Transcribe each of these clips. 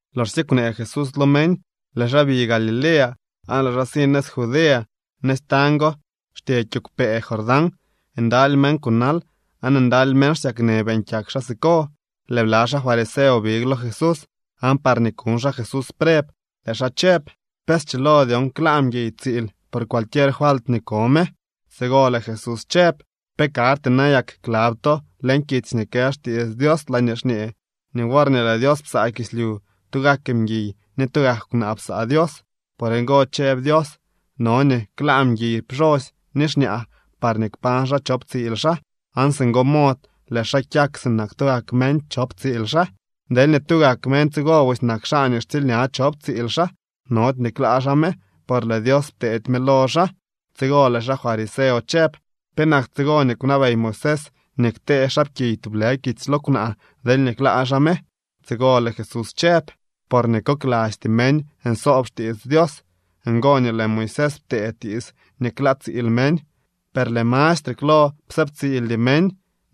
Loxsye kwnee Jesús lo meñ, lëë xaa bi Galilea, aan lëë xaa si nëz Judea. Nëz tañ go xtye kiigwpee Jordán. Ndaly meñ kunal aan ndaly meñ xsyaknë beeñ kyak xaa siko. Lëë bla xaa fariseo big lo Jesús aan parñee kuñ xaa Jesús preb, lëë xaa chëb: —¿Pe schilo dyon klaa mguiy tsiil por cualquier falt nii ko me? Tsigo lëë Jesús chëb: —¿Pe karty nayak klab to leñ kitsy nii kë xtiits Dios laañee xñee nii worñee lëë Dios psaa kislyu, tugak mguiy ni tugak kwnaa psaa Dios? Por ngo chëb Dios: “No nii klaa mguiy pxosy ni xñaa parñee kpañ xaa chop tsiil xaa, aan singo mod lëë xaa kyak sinak tugak meñ chop tsiil xaa.” Deelñee tugak meñ tsigo busy nak xaa nii xtsiilña chop tsiil xaa, nody nii klaa xaa me, por lëë Dios pteedy me lo xaa. Tsigo lëë xaa fariseo chëb: —¿Penak tsigo nii kwnabey Moisés nii ktee xaapkiy tublë kitsy lo kwnaa, deelñee klaa xaa me? Tsigo lëë Jesús chëb: —Porñee koklasty meñ nsoob xtiits Dios, ngo nii lëë Moisés ptee tiits nii klaa tsiil meñ, per lëë mastre klo psëëbtsiildy meñ.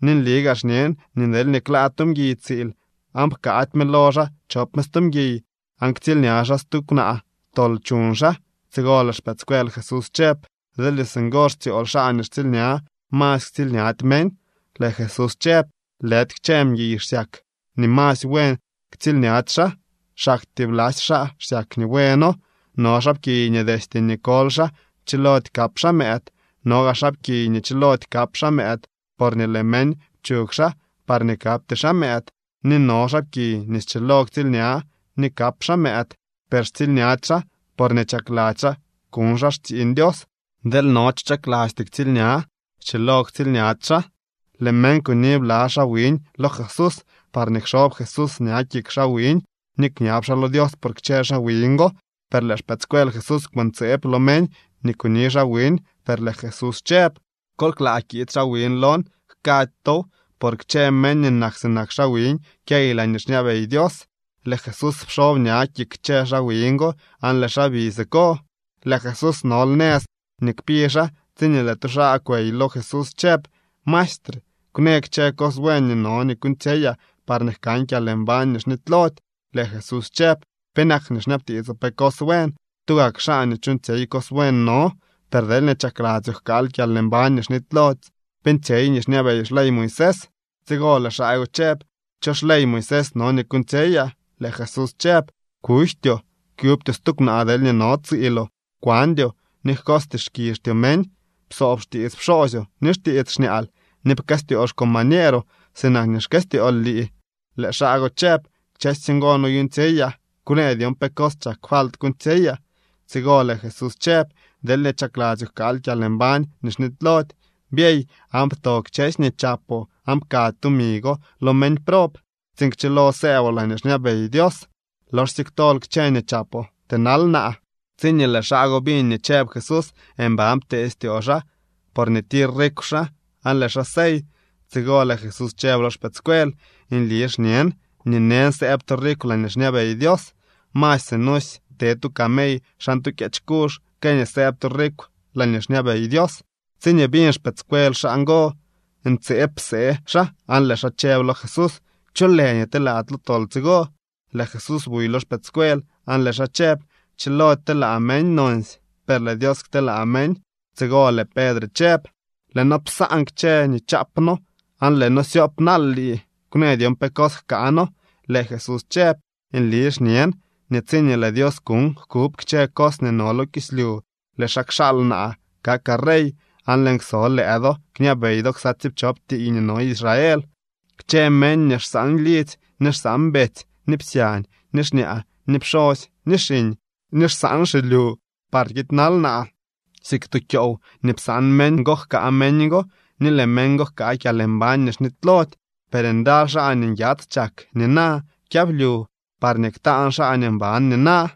Ni nli gaa xñen nii deelñee klaa tu mguiy tsiil, aan pkaady me lo xaa chop me stu mguiy, aan ktsiilña xaa stu kwnaa, tol chuñ xaa. Tsigo lëë xpëëdscuel Jesús chëb: —Deelñee singo xtsyool xaa nii xtsiilña, masy ktsiilñady meñ. Lëë Jesús chëb: —Lëdy kchë mguiy xsyak nii masy buen tsiilñady xaa, xaktyee blasy xaa xsyak nii bueno. No xaapkiy nii destye nii koly xaa, chilody kap xaa mëëd. No gaa xaapkiy nii chilody kap xaa mëëd porñee lëë meñ pchug xaa parñee kapty xaa mëëd. Ni no xaapkiy nii schilo ktsiilña ni kap xaa mëëd, per xtsiilñady xaa porñee chakladzy xaa kuñ xaa xtsiiñ Dios. Deel no cho chaklasty ktsiilña, schilo ktsiilñady xaa. Lëë meñ kuni bla xaa wiñ lo Jesús parñee kxob Jesús ña kik xaa wiñ ni kñab xaa lo Dios por kchë xaa wiñ go, per lëë xpëëdscuel Jesús kwëntseeb lo meñ nii kuni xaa wiñ. Per lëë Jesús chëb: —Kol klaa kiid xaa wiñ lon, jkady tow. Por kchë meñ nii nak sinak xaa wiñ kyey laañee xñabey Dios. Lëë Jesús pxob ña kik kchë xaa wiñ go, aan lëë xaa bi siko. Lëë Jesús nol nëz nii kpi xaa tsiñee lëë tu xaa kwey lo Jesús chëb: —Maestre, kwnë kchë cos buen nii no kuuñtsyeyaa parñee jkan kyalmbañ nii xnitylody. Lëë Jesús chëb: —¿Penak nii xñabtiitsoo pe cos buen? Tugak xaa nii chuuñtsyey cos buen no. Per deelñee chakladzyoo jkaal kyalmbañ nii xnitylody, beeñtsyey nii xñabey xley Moisés. Tsigo lëë xaa go chëb: —¿Cho xley Moisés no nii kuuñtsyeyaa? Lëë Jesús chëb: —Kujtyoo, kyubtyoo stu kwnaa deelñee no tsiiloo, kwandyoo, ni jkots tiitskizhtyoo meñ, psoob xtiits pxoosyoo ni xtiits xñaal, ni pkëstyoo xcombañeeroo sinak xkëstyool lii. Lëë xaa go chëb: —Kchësy ngo noyuuñtsyeyaa. Kwnë dyon pe cos chak falt kuuñtsyeyaa. Tsigo lëë Jesús chëb: —Deelñee chakladzyoo jkaal kyalmbañ nii xnitylody, byey aan pto kchësy nii chapoo aan pkady tumi go lo meñ prob tsiin kchilo sëëboo laañee xñabey Dios. Loxsye ktol kchë nii chapoo, tënal naa. Tsiñee lëë xaa go biñ nii chëb Jesús, mban ptee styoo xaa porñee tir rikw xaa, aan lëë xaa sey. Tsigo lëë Jesús chëb lo xpëëdscuel: —Nli xñen nii neñ sëëb tu rikw laañee xñabey Dios. Masy sinusy te tu camey xan tu kyeech kuzh que nii sëëb tu rikw laañee xñabey Dios. Tsiñee biñ xpëëdscuel xaa ngo, ntseeb psee xaa aan lëë xaa chëb lo Jesús: —¿Cho lë nii telaa lo tol tsigo? Lëë Jesús buy lo xpëëdscuel aan lëë xaa chëb: —Chilody telaa meñ nonsy, per lëë Dios kteelaa meñ. Tsigo lëë Pedre chëb: —Lëë noo psaan kchësy nii chaap noo aan lëë noo syoop naal lii. Kwnë dyon pe cos jkaa noo. Lëë Jesús chëb: —Nli xñen nii tsiñee lëë Dios kuuñ jkub kchë cos nii no lo kislyu, lëë xaa kxaal naa kakaa rey, aan lëën kso lëë do kñabey do ksa tsiipchop tiiy nii no Israel. Kchë meñ nii xsaan lidzy, ni xsaan betsy ni psyañ ni xñaa ni pxosy ni xiñ, ni xsaan xilyu parñee kiidnal naa, siik tu kyoow nii psaan meñ go jkaa meñ go ni lëë meñ go jkaa kyalmbañ nii xnitylody. Per ndaly xaa nii nyats chak nina kyablyu, parñee ktaan xaa nii mban nina.